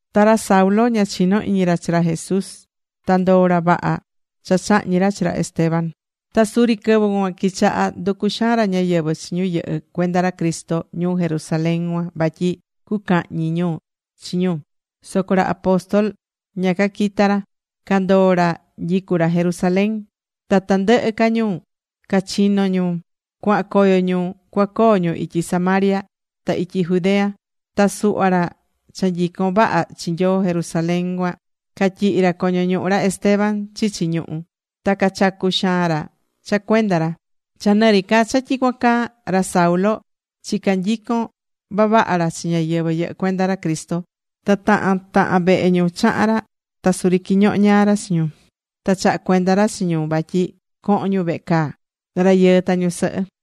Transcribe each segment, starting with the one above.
Ta ra Saulo ña chinó iñi ra chi ra Jesús, ta ndoó ra vaha cha chahñi̱ ra chi ra Esteban. Ta suri quɨvɨ cuan quichaha nducu xaan ñáyɨvɨ chi ñu yɨhɨ́ cuenda ra Cristo ñuu Jerusalén cuan vatyi cucahñi ñu chi ñu. Soco ra apóstol ña caquita̱ ra. Candoo ra nyicú ra Jerusalén. Ta tandɨhɨ ca ñu cachino ñu, cuahan coyo ñu cuacoo ñu ityi Samaria, ta ityi Judea. Ta suhva ra cha nyicón vaha chi Nyoo Jerusalén cuan, catyihi̱ ra coño ñuhu ra Esteban chichi ñuhú. Ta cachacu̱ xaan ra cha cuenda ra. Cha nɨri ca cha tyicuan caa, ra Saulo chicá nyicon vavaha ra chi ñáyɨvɨ yɨhɨ́ cuenda Cristo. Ta tahan tahan vehe ñu chaha̱n ra. Ta suri quiñoho ñaa ra chi ñu, ta chaha̱ cuenda ra chi ñu vatyi cohon ñu vehe caa, rayɨɨ ta ñusɨhɨ.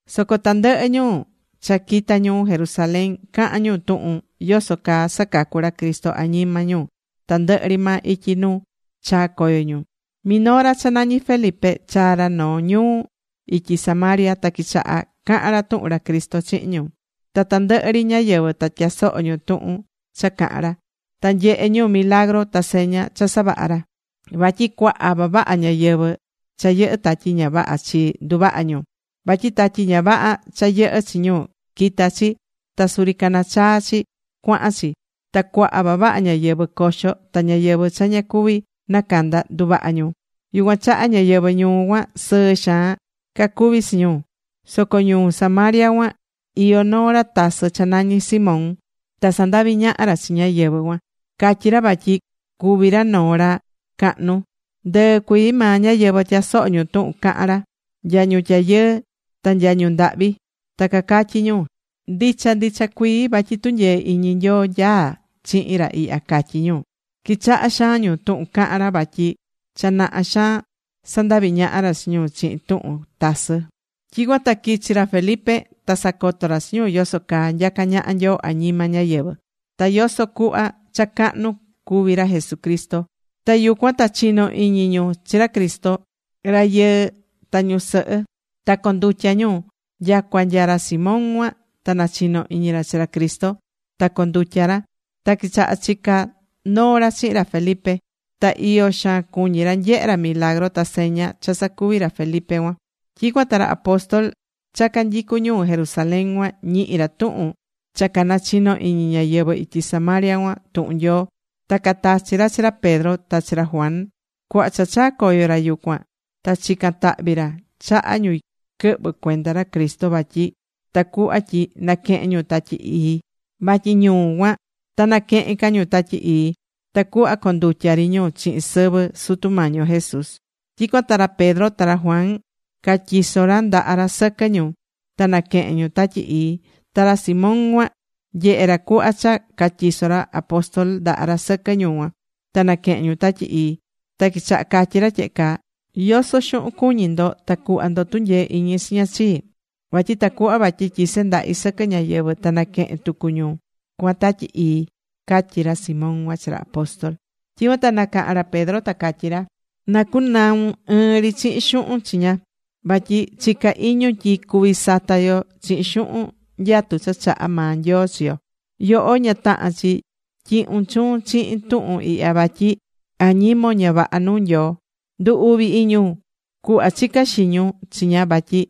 Soco tandɨhɨ ñu cha quita̱ ñuu Jerusalén, cahán ñu tuhun yoso caa sacacú ra Cristo añima ñu tandɨhɨ ri maa ityi nu chaa̱ coyo ñu. Minoo ra cha nañí Felipe chaa̱ ra noo ñuu ityi Samaria. Ta quichaha̱ cahan ra tuhun ra Cristo chihin ñu. Ta tandɨhɨ ri ñáyɨvɨ ta tyasoho̱ ñu tuhun cha cahán ra. Ta nyehé ñu milagru ta seña cha savahá ra. Vatyi cuaha vavaha ñáyɨvɨ cha yɨhɨ́ tatyi ña vaha chii nduvaha ñu. Vatyi tatyi ña vaha cha yɨhɨ́ chi ñu, quita̱ chi ta suri canachaa̱ chi cuahan chi. Ta cuaha vavaha ñáyɨvɨ coxo ta ñáyɨvɨ cha ña cuví nacanda, nduvaha ñu. Yucuan chaha ñáyɨvɨ ñuu cuan, sɨɨ xaan cacuví chi ñu. Soco ñuu Samaria cuan iyó noo ra tasɨ cha nañí Simón. Ta sandaví ñaha ra chi ñáyɨvɨ cuan. Catyí ra vatyi cuví ra noo ra cahnu. Ndɨɨ cuii maa ñáyɨvɨ tyasohó ñu tuhun cahan ra, nya ñu tyayɨɨ, ta nya ñu ndahvi. Ta cacatyí ñu: ―Ndicha ndicha cuii, vatyi tunyee iñi Nyoo nyaá chihin ra ihya ―catyí ñu. Quichahá xaan ñu tuhun cahán ra vatyi cha naha xaan sandaví ñaha ra chi ñu chihin tuhun tasɨ. Tyicuan ta quichi̱ ra Felipe. Ta sacoto ra chi ñu yoso caa nyacá ñaha Nyoo añima ñáyɨvɨ. Ta yoso cuhva cha cahnu cuvi ra Jesucristo. Ta yucuan ta chino iñi ñu chi ra Cristo, rayɨɨ ta ñusɨhɨ. Ta condutya̱ ñu. Nyacua nya ra Simón cuan, ta nachino̱ iñi ra chi ra Cristo, ta condutya̱ ra. Ta quichaha̱ chica noo ra chihin ra Felipe. Ta iyo xaan cuñi̱ ra nyehe ra milagru, ta seña cha sacuví ra Felipe cuan. Tyicuan ta ra apóstol cha canyicú ñuu Jerusalén cuan ñihi̱ ra tuhun cha canachinó iñi ñáyɨvɨ ityi Samaria cuan tuhun Nyoo. Ta catachi̱ ra chi ra Pedro ta chi ra Juan. Cuhva cha chaa̱ coyo ra yucuan, ta chica̱n tahvi ra chaha ñu quɨhvɨ̱ cuenda ra Cristo vatyi tacuhva tyi naquehen ñu Tatyi Ii. Vatyi ñu cuan, ta naquehen ca ñu Tatyi Ii. Tacuhva condutya̱ ri ñu chihin sɨvɨ Sutu Mañi yo Jesús. Tyicuan ta ra Pedro ta ra Juan catyiso̱ ra ndaha ra sɨquɨ ñu, ta naquehe̱n ñu Tatyi Ii. Ta ra Simón cuan nyehe̱ ra cuhva cha catyiso̱ ra apóstol ndaha ra sɨquɨ ñu cuan, ta naquehe̱n ñu Tatyi Ii. Ta quichaha̱ catyi ra tyehe caa: ―Yoso xuhun cuñí ndo ta cuhva ndo tunyee iñi chiña chii, vatyi tacuhva cuvi tyise ndahi sɨquɨ ñáyɨvɨ, ta naquehen tucu ñu cuan Tatyi Ii ―catyi ra Simón cuan chi ra apóstol. Tyicuan ta nacaha̱n ra Pedro ta catyí ra: ―Na cunaun ɨɨn ri chihin xuhun chiña. Vatyi chicá iñun tyi cuví sata yo chihin xuhun nyatu cha chahá maa Nyoo chi yo. Yoho, ña tahán chi tyihun chuun chihin tuhun ihya. Vatyi añimon ña vaha nuu Nyoo. Ndu̱ uvi iñun cuhva chicá xiñun chiña, vatyi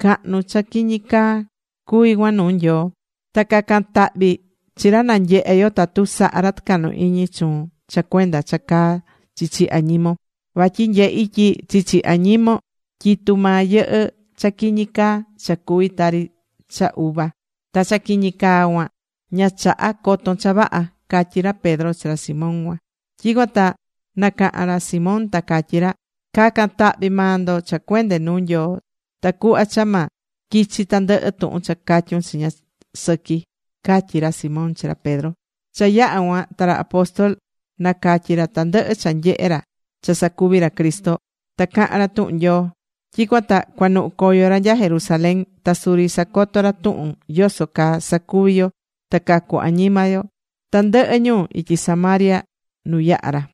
cahnu cha quiñi caa cuví cuan nuu Nyoo. Ta ca̱can tahvi chi ra na nyehe yo tatu saha ra tɨcahnu iñi chuun cha cuenda cha caa chichi añimon. Vatyi nyehí tyi chichi añimon tyitú maa yɨhɨ́ cha quiñi caa cha cuvi tari cha uva. Ta cha quiñi caa cuan, ña chahá coton cha vaha. ―catyí ra Pedro chi ra Simón cuan. Tyicuan ta nacaha̱n ra Simón ta catyí ra: ―Ca̱can tahvi maa ndo cha cuende nuu Nyoo, ta cuhva cha ma quichi tandɨhɨ tuhun cha catyún chiña sɨqui ―catyí ra Simón chi ra Pedro. Cha yaha̱ cuan ta ra apóstol nacatyi̱ ra tandɨhɨ cha nyehe̱ ra cha sacuvi̱ ra Cristo. Ta caha̱n ra tuhun Nyoo. Tyicuan ta cuanuhu̱ coyo ra nya Jerusalén. Ta suri sacoto ra tuhun yoso caa sacuví yo ta cacu añima yo tandɨhɨ ñuu ityi Samaria nu yaha̱ ra.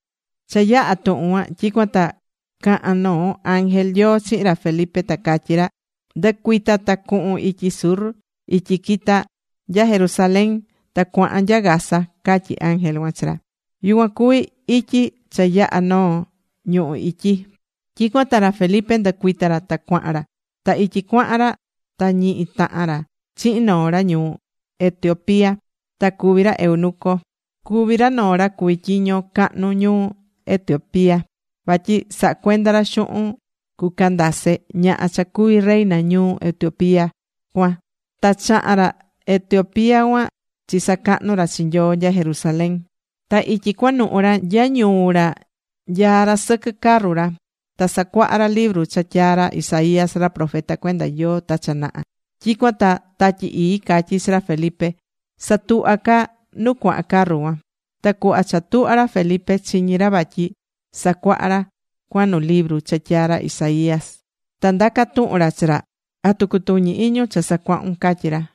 Cha yaha̱ tuhun cuan tyicuan ta caha̱n noo ángel Nyoo chihin ra Felipe, ta catyí ra: ―Ndɨ̱cuita ta cuhun ityi sur, ityi quita nya Jerusalén ta cuahan nya Gaza ―catyí ángel cuan chi ra. Yucuan cuvi ityi cha yahá noo ñuhú ityi. Tyicuan ta ra Felipe ndɨcuita ra ta cuahan ra. Ta ityi cuahan ra ta ñihi tahan ra chihin noo ra ñuu Etiopía. Ta cuvi ra eunuco. Cuví ra noo ra cuví tyiño cahnu ñuu Etiopía, vatyi sahá cuenda ra xuhun cu Candace, ñaha cha cuví reina ñuu Etiopía cuan. Ta chaha̱n ra Etiopía cuan chisacahnu̱ ra chi Nyoo nya Jerusalén. Ta ityi cuanuhú ra nya ñuu ra nyaá ra sɨquɨ carru ra. Ta sacuahá ra libru cha tyaa̱ ra Isaías ra profeta cuenda Nyoo ta cha naha. Tyicuan ta Tatyi Ii catyí chi ra Felipe: ―Sa̱tuhva ca nu cuahan carru cuan. Ta cuhva cha tuhva̱ ra Felipe, chiñi̱ ra vatyi sacuahá ra cuan nu libru cha tyaa̱ ra Isaías. Ta ndaca̱ tuhun ra chi ra: ―¿Atu cutuñí iñun cha sacuahún? ―catyí ra.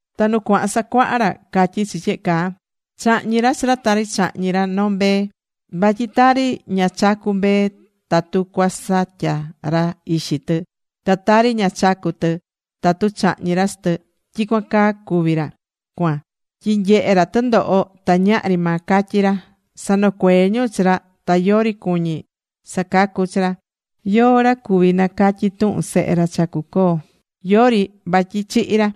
Ta nu cuahan sacuaha ra, catyí chi tyehe caa: Chahñi̱ ra chi ra tari chahñí ra noo mbee. Vatyi tari ña chacú mbee tatu cuasatya ra ixi tɨ, ta tari ña chacú tɨ tatu chahñi ra chi tɨ, tyicuan caa cuví ra cuan tyi nyehe̱ ra tɨndoho ta ñahri maa catyi ra. Sanocuee̱ ñu chi ra ta yori cuñí sacacu chi ra. ¿Yóó ra cuvi nacatyi tuhun sehe ra cha cuacoo? Yori, vatyi chihi̱ ra.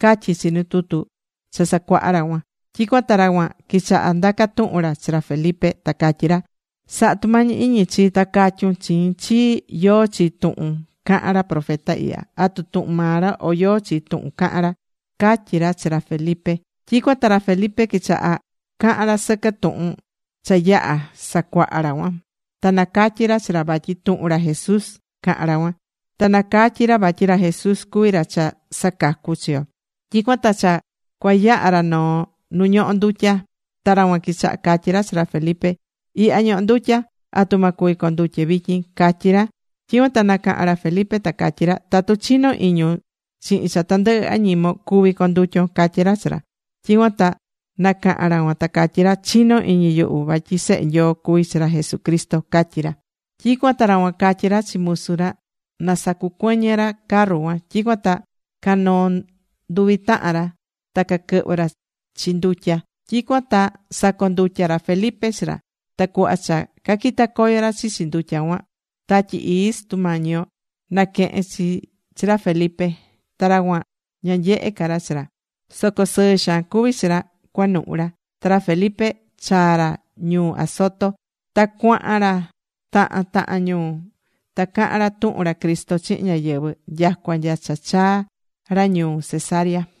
Catyí chi nu tutu cha sacuaha ra cuan. Tyicuan ta ra cuan quichaha̱ ndaca tuhun ra chi ra Felipe, ta catyí ra: ―Sa̱ha tumañi iñi chii, ta ca̱tyun chiin chii yóó chi tuhun cahán ra profeta ihya. ¿Atu tuhun maa ra, o yóó chi tuhun cahán ra? ―catyí ra chi ra Felipe. Tyicuan ta ra Felipe quichaha̱ cahan ra sɨquɨ tuhun cha cha yaha̱ sacuaha ra cuan, ta nacatyí ra chi ra vatyi tuhun ra Jesús cahán ra cuan. Ta nacatyí ra vatyi ra Jesús cuví ra cha sacacú chi yo. Tyicuan ta cha cuayaha ra noo nu ñohó ndutya. Ta ra cuan quichaha̱ catyí ra chi ra Felipe: ―Ihya ñohó ndutya. ¿Atu ma cuvi condutye vityin? ―catyí ra. Tyicuan ta nacaha̱n ra Felipe, ta catyí ra: ―Tatu chinó iñun chihin cha tandɨhɨ añimon, cuví condutyon ―catyí ra chi ra. Tyicuan ta nacaha̱n ra cuan, ta catyí ra: ―Chinó iñi yuhu vatyi Sehe Nyoo cuví chi ra Jesucristo ―catyí ra. Tyicuan ta ra cuan catyí ra chi musu ra na sacucuɨñɨ ra carru cuan. Tyicuan ta canoo̱ nduvi tahan ra. Ta caquɨhvɨ̱ ra chi ndutya. Tyicuan ta sacondutya̱ ra Felipe chi ra. Ta cuhva cha caquita̱ coyo ra chichi ndutya cuan, Tatyi Ii Sutu Mañi yo naquehe̱n chi chi ra Felipe. Ta ra cuan ña nyehe̱ ca ra chi ra. Soco sɨɨ xaan cuví chi ra, cuanuhu ra. Ta ra Felipe chaa̱ ra ñuu Azoto. Ta cuahan ra tahan tahan ñuu, ta caha̱n ra tuhun ra Cristo chihin ñáyɨvɨ nyacua nya cha chaa̱ ra ñuu Cesarea.